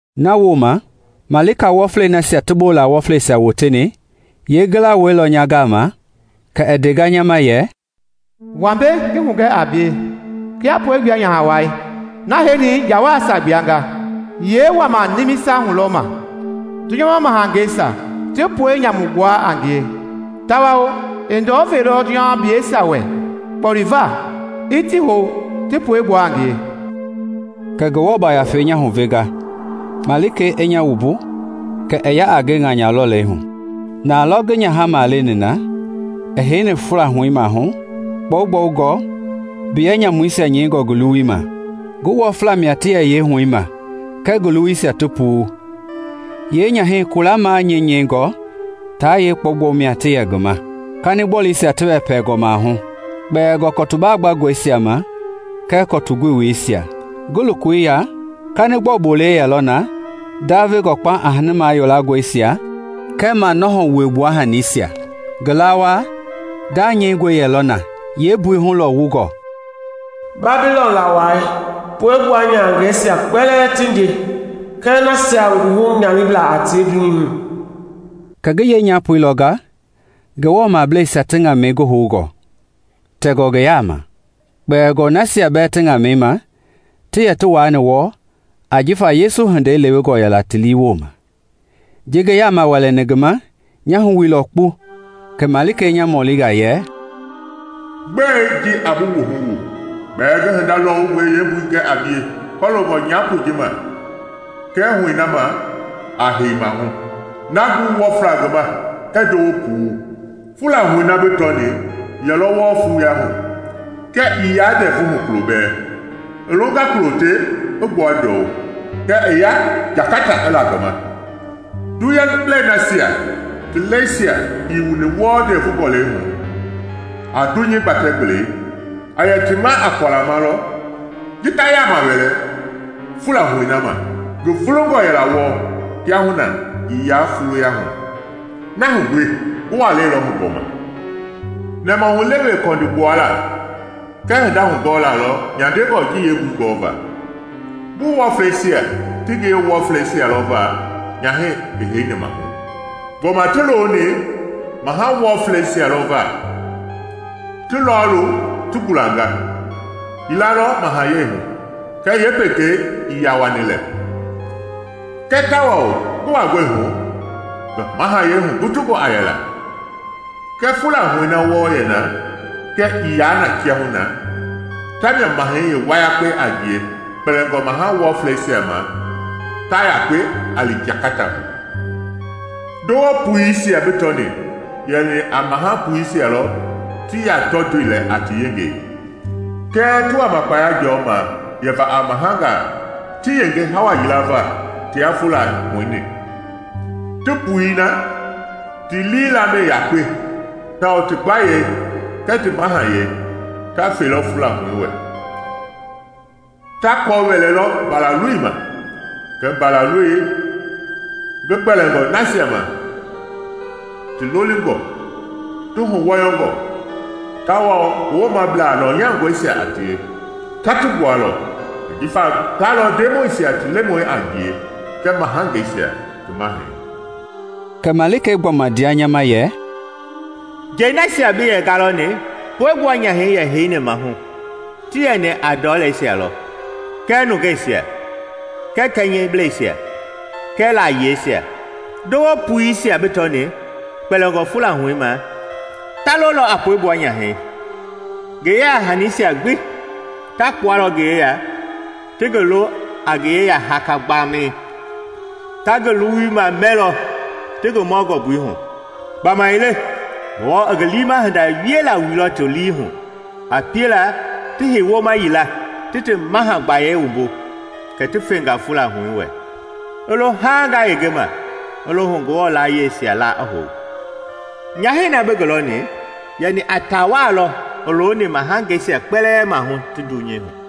Nawooma, malika wɔflei nasia ti bola wɔfleisia woteni, yeengila wailɔ nya gama kɛ i ndea nya ma yɛ, “Wa mbei ngi hugɛ a bie kia puegbua nyaha wai, na heini njawaisia gblanga, yee wama nimisa hulɔma la. Dunyama mahangeisia ti pue nyamu gbuanga a ngie, tawao i ndɔ veilɔ dunyamableisia wɛ kpoli va i ti hou ti puegbua a ngie.” Kɛ Ngafei nya huvenga malikei i nya wumbu kɛ i ya a nge ŋanya lɔlei hu. Nalɔ ngi nyahɛi maleni na i heini fula huɛi maahu kpɔgbɔungɔ mbiyɛ nyamuisia nyɛingɔ ngi luwuima; ngu wɔfla mia ti yɛ yeehuɛi ma kɛɛ ngi lowoisia ti puu. Yee nyahɛi kula manyinyingɔi taa yee kpɔgbɔu mia ti yɛ ngi ma, kanigbɔluisia ti wɛpɛngɔ maahu, kpɛlingɔ kɔtu baagbangɔisia ma kɛɛ kɔtu goweisia. Ngi lokoi ya, kanigbɔu bolei yɛlɔ na ndavengɔ kpauŋ a hani mayolangɔisia kɛɛ manɔhɔ wuegbua hanisia. Ngi lawaa nda nyɛingɔi yɛlɔ na yeembui hulɔwungɔ: “Babilɔn Lawai, puegbua nyahangɛisia kpɛlɛɛ ti nje kɛɛ nasia nguhu nyaniblaa a tie dunyei hu.” Kɛ ngi yee nyapoi lɔnga Ngewɔ mableisia ti ŋamɛi ngi houngɔ tɛngɔ ngi yaama, kpɛlingɔ nasia bɛɛ ti ŋamɛi ma ti yɛ ti waani wɔɔ jifa Yesu hindei lewengɔ yɛla ti lii woma. Ji ngi yaama wɛlɛni ngi ma, nya wuhu wuilɔ kpu. Kɛ malikei nya mɔlinga yɛ, “Gbe ji a bi wuhu wu? Gbɛɛ ngi hinda lɔwungɔi yeembui gɛ a bie kɔloongɔ nyapoi ji ma kɛɛ huɛi na ma a hei maahu, na ngu wɔfla ngi ma kɛɛ ndowo puu. Fula huɛi na bi tɔni yɛlɔ wɔɔ fuuyahu, kɛɛ ii yaa ndɛvuhu kulo bɛɛ; i longa kulo te i gbua ndɔu kɛ i ya jangata i la ngi ma. Dunyamablei nasia ti lɛisia ii wuni wɔɔ ndɛɛvu gɔlɛi hu a dunyei ngi gbatɛ gbelei a yɛ ti ma a kualama lɔ ji ta yaama wɛlɛ fula huɛi ma. Ngi vulungɔ yɛla wɔɔ; kiahuna ii yaa fuuyahu, na hu gbi ngi walɛi lɔ hu gbɔma. “Nɛmahulewe kɔndi gbuala kɛɛ hinda hugɔɔla lɔ nyandengɔ ji yeembui gɔɔva. Ngu wɔfleisia ti ngiye wɔfleisia lɔ va nyahɛi heini maahu. Gbɔma ti looni maha wɔfleisia lɔ va. Ti lɔɔlu ti gulanga, yila lɔ mahayɛi hu, kɛɛ yeepekei ii yaa wani lɛ; kɛɛ tawao ngi wangɔi hu, ngi mahayɛi hugutungɔ a yɛla. Kɛ fula huɛi na wɔɔ yɛna, kɛɛ ii yaa na kiahuna, tamia mahɛi yeewayakpei a ngie kpɛlingɔ maha wɔfleisia ma ta yakpe a li jangata hu. “Ndowo puisia bi tɔni yɛni a maha puisia lɔ tii yaa tɔtoi lɛ a ti yengei, kɛɛ ti wama kpaya jɔma yɛva a mahangaa ti yenge hawa yila va tia fula huɛi-ni. Ti puii na ti lii lamɛi yakpe tawao ti gbayei kɛɛ ti mahayɛi ta felɔ fula huɛi wɛ. Ta kɔ wɛlɛlɔ Mbalaloi ma, kɛɛ Mbalaloi, ngi gbɛlingɔ nasia ma ti lolingɔ, ti huwɔyɔngɔ tawao ngi womablaa lɔnyangɔisia a tie, taa ti gbualɔ, ajifa ta lɔ ndemɔisia ti Lemɔi a ngie kɛɛ mahangeisia ti Mahɛi.” Kɛ malikei gbɔma ndea nya ma yɛ, “Njei nasia bi yɛ ngalɔni puegbua nyahɛi yɛ heini maahu ti yɛni a ndɔleisia lɔ, kɛɛ nungeisia, kɛɛ kɛnyɛbleisia, kɛɛ layiesia. Ndowo puisia bi tɔni, kpɛlɛngɔ fula huɛi ma, ta lololɔ a puegbua nyahɛi. Ngi yeya hanisia gbi ta kpualɔ ngi yeya ti ngi lo a ngi yeya haka gbami; ta ngi luwuima mɛlɔ ti ngi mɔ ngɔmbui hui. Gbamaile Ngewɔ i ngi liima hinda wiela wuilɔ ti liihu, a piela ti hei woma yila ti ti maha gbayei wumbu kɛ ti fenga fula huɛi wɛ, i lo haaŋ ngayenge ma i lo hu Ngewɔ layieisia laa i hou. “Nyahɛi na bi ngi lɔni yɛni a tawaa lɔ i looni mahangeisia kpɛlɛɛ maahu ti dunyei hu.”